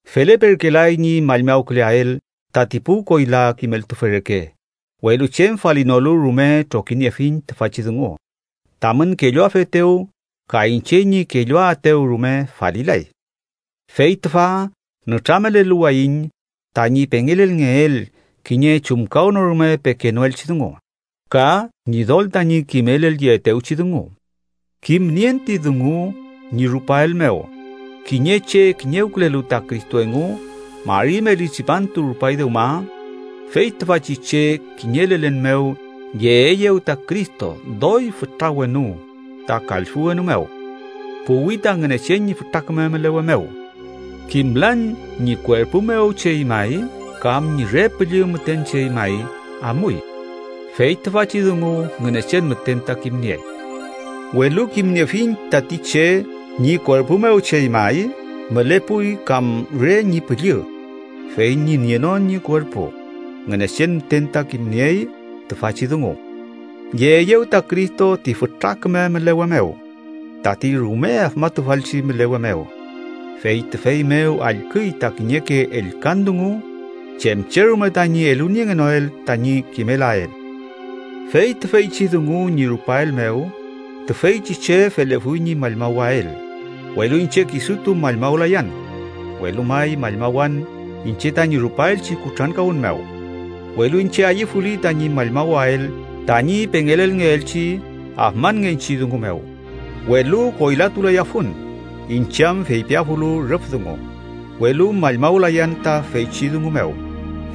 Feleperkelay ñi mallmawküleael tati pu koyla kimeltufe reke, welu chem falinolu rume trokiniefiñ tüfachi dungu tamün kelluafetew ka iñche ñi kelluaetew rume falilay. Fey tüfa nütrameleluwayiñ tañi pengelelngeel kiñe chumkawnorume pekenoelchi dungu, ka Ñidol tañi kimelelyeetewchi dungu. Kimnien ti dungu ñi rupael mew kiñe che kiñewkülelu ta Cristo engu mari meli tripantu rupay dewma, fey tüfachi che kiñe lelen mew yeeyew ta Cristo doy fütra wenu ta kallfü wenu mew puwi ta Ngünechen ñi fütra küme mülewe mew. Kimlan ñi kuerpu mew chey may kam ñi re püllü müten chey may amuy. Fey tüfachi dungu Ngünechen müten ta kimniey. Welu kimniefiñ tati che (ñi kuerpu mew chey may mülepuy kam re ñi püllü, fey ñi nienon ñi kuerpu, Ngünechen müten ta kimniey tüfachi dungu) yeeyew ta Cristo ti fütra küme mülewe mew, tati rume afmatufalchi mülewe mew, fey tüfey mew allküy ta kiñeke ellkan dungu chem che rume tañi eluniengenoel tañi kimelael. Fey tüfeychi dungu ñi rupael mew tüfeychi che felefuy ñi mallmawael, welu iñche kisutu mallmawlayan, welu may mallmawan iñche tañi rupaelchi kutrankawün mew. Welu iñche ayüfuli tañi mallmawael tañi pengelelngeelchi afmanngechi dungu mew, welu koylatulayafun, iñche am feypiafulu rüf dungu. Welu mallmawlayan ta feychi dungu mew,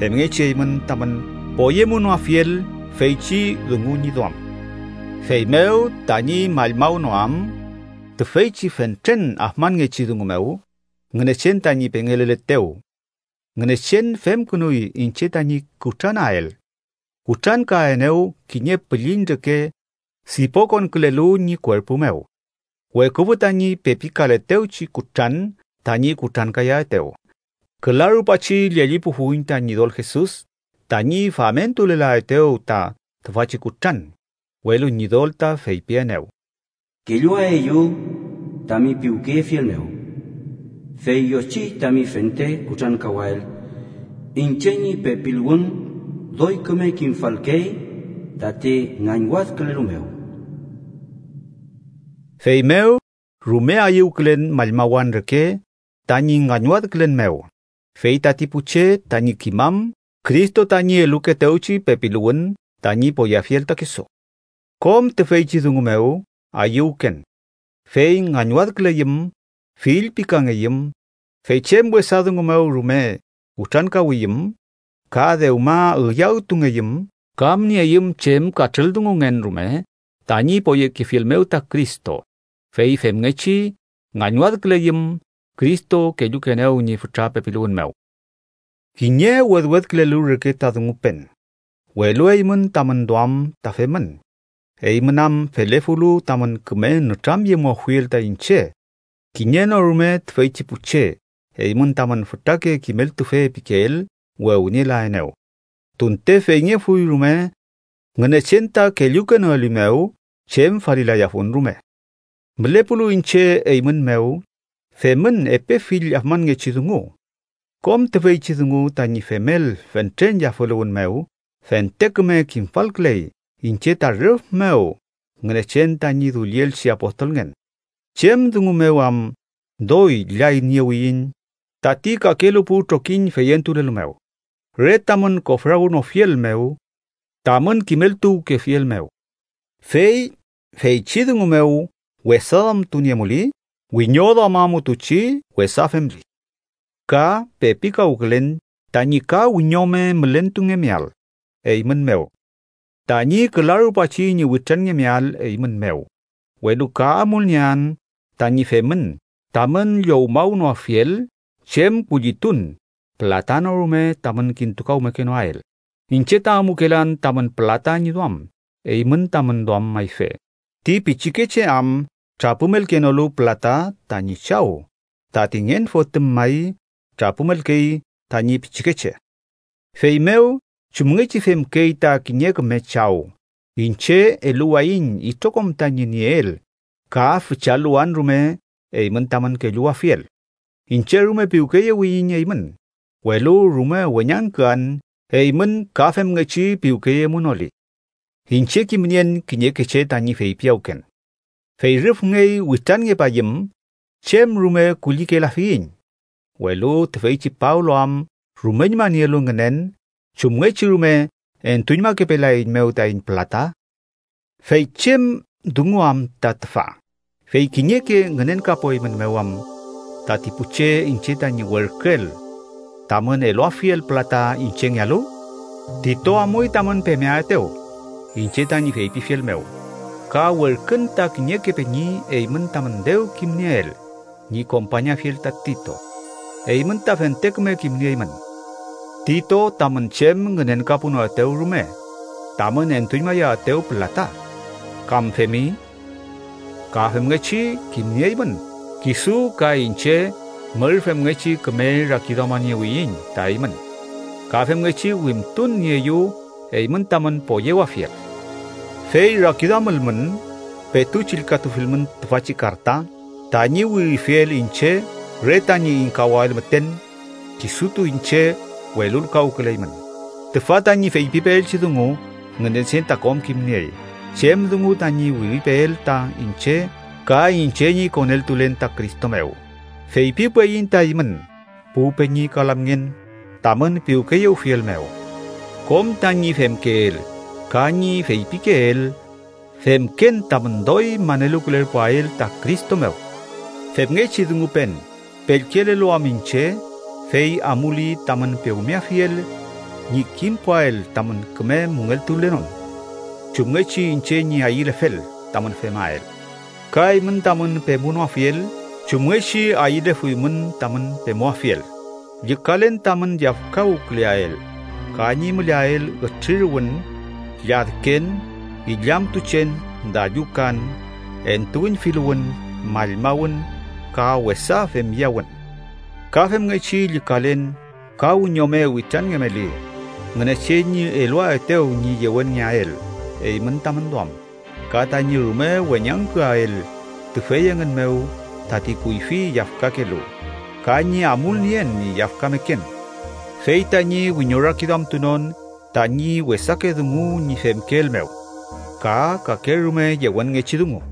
femngechi eymün tamün poyemunoafiel feychi dungu ñi duam. Feymew, tañi mallmawnoam tüfeychi fentren afmanngechi dungu mew Ngünechen tañi pengeleletew, Ngünechen femkünuy iñche tañi kutranael. Kutrankaenew kiñe pülliñ reke sipokonkülelu ñi kuerpu mew, weküfü tañi pepikaletewchi kutran tañi kutrankayaetew. Küla rupachi llellipufuiñ ta Ñidol Jesus mew tañi famentulelaetew ta tüfachi kutran. Welu Ñidol ta feypienew: “Kelluaeyu, tami piwkeyefiel mew, fey yochiy tami fente kutrankawael, iñche ñi pepiluwün doy küme kimfalkey tati ngañwadkülelu mew.” Feymew rume ayüwkülen mallmawan reke tañi ngañwadkülen mew fey tati pu che tañi kimam Cristo tañi elukeetewchi pepiluwün tañi poyeafiel ta kisu. Kom tüfeychi dungu mew ayüwken, fey ngañwadküleyüm, fillpikangeyüm, fey chem wesa dungu mew rume kutrankawiyüm, ka dewma üyawtungeyüm kam nieyüm chem katrüldungungen rume tañi poyekefiel mew ta Cristo, fey femngechi ngañwadküleyüm, Cristo kellukeenew ñi fütra pepiluwün mew. Kiñe wedwedkülelu reke ta dungupen, welu eymün tamün duam ta femün. Eymün am felefulu tamün küme nütramyemuafiel ta iñche, kiñe no rume tüfeychi pu che eymün tamün fütrake kimeltufe pikeel wewnielaenew. Tunte feyngefuy rume Ngünechen ta kellukenoelimew, chem falilayafun rume. Mülepulu iñche eymün mew, femün epe fill afmanngechi dungu kom tüfeychi dungu tañi femel fentren yafüluwün mew fente küme kimfalküley iñche ta rüf mew Ngünechen tañi dullielchi apostolngen. Chem dungu mew am doy llayniewiñ tati kakelu pu trokiñ feyentulelu mew. Re tamün kofrawnofiel mew tamün kimeltuwkefiel mew. Fey feychi dungu mew wesa duamtuniemuli wiñoduamamutuchi wesa femli. Ka pepikawkülen tañi ka wiñome mülentungemeael, eymün mew, tañi küla rupachi ñi witranngemeael eymün mew, welu ka amulniean tañi femün tamün llowmawnoafiel chem kullitun pülata no rume tamün kintukawmekenoael iñche ta amukelan tamün pülata ñi duam eymün tamün duam mayfe, ti pichikeche am trapümelkenolu pülata tañi chaw, tati ngen fotüm may trapümelkey tañi pichikeche. Feymew chumngechi femkey ta kiñe küme chaw iñche, eluwayiñ itrokom tañi nieel ka füchaluwan rume eymün tamün kelluwafiel. Iñche rume piwkeyewiyiñ eymün, welu rume weñangküan eymün ka femngechi piwkeyemunoli. Iñche kimnien kiñeke che tañi feypiyawken: “Fey rüfngey witranngepayüm, chem rume kullikelafiyiñ”, welu tüfeychi Pablo am rumeñma nielu ngünen chumngechi rume entuñmakepelaeiñmew taiñ pülata. ¿Fey chem dungu am ta tüfa, fey kiñeke ngünenkapueymünmew am tati pu che iñche tañi werküel tamün eluafiel pülata iñchengealu? Tito amuy tamün pemeaetew iñche tañi feypifiel mew ka werkün ta kiñeke peñi eymün tamün dew kimnieel ñi kompañafiel ta Tito. Eymün ta fente küme kimnieymün, Tito tamün chem ngünenkapunoetew rume tamün entuñmayaetew pülata, ¿kam femi? Ka femngechi kimnieymün kisu ka iñche mür femngechi küme rakiduamaniewiyiñ ta eymün ka femngechi wimtun nieyu eymün tamün poyewafiel. Fey rakiduamülmün, petu chillkatufilmün tüfachi karta, tañi wirifiel iñche re tañi ingkawael müten kisutu iñche, welulkawküleymün. Tüfa tañi feypipeelchi dungu Ngünechen ta kom kimniey chem dungu tañi wiripeel ta iñche ka iñche ñi koneltulen ta Cristo mew. Feypiwpeyiñ ta eymün, pu peñi ka lamngen, tamün piwkeyewfielmew. Kom tañi femkeel ka ñi feypikeel femken tamün doy maneluwkülerpuael ta Cristo mew. Femngechi dungupen pellkelelu am iñche, fey amuli tamün pewmeafiel ñi kimpuael tamün küme müngeltulenon chumngechi iñche ñi ayülefel tamün femael, ka eymün tamün pemunoafiel chumngechi ayülefuymün tamün pemuafiel. Llükalen tamün yafkawküleael, ka ñi müleael ütriruwün, lladken, illamtuchen, dallukan, entuüñfiluwün, mallmawün ka wesa femyawün. Ka femngechi llükalen ka wiñome witranngemeli, Ngünechen ñi eluaetew ñi yewenngeael eymün tamün duam ka tañi rume weñangküael tüfey engün mew tati kuyfi yafkakelu ka ñi amulnien ñi yafkameken, fey tañi wiñorakiduamtunon tañi wesake dungu ñi femkeel mew, ka kakerume yewenngechi dungu.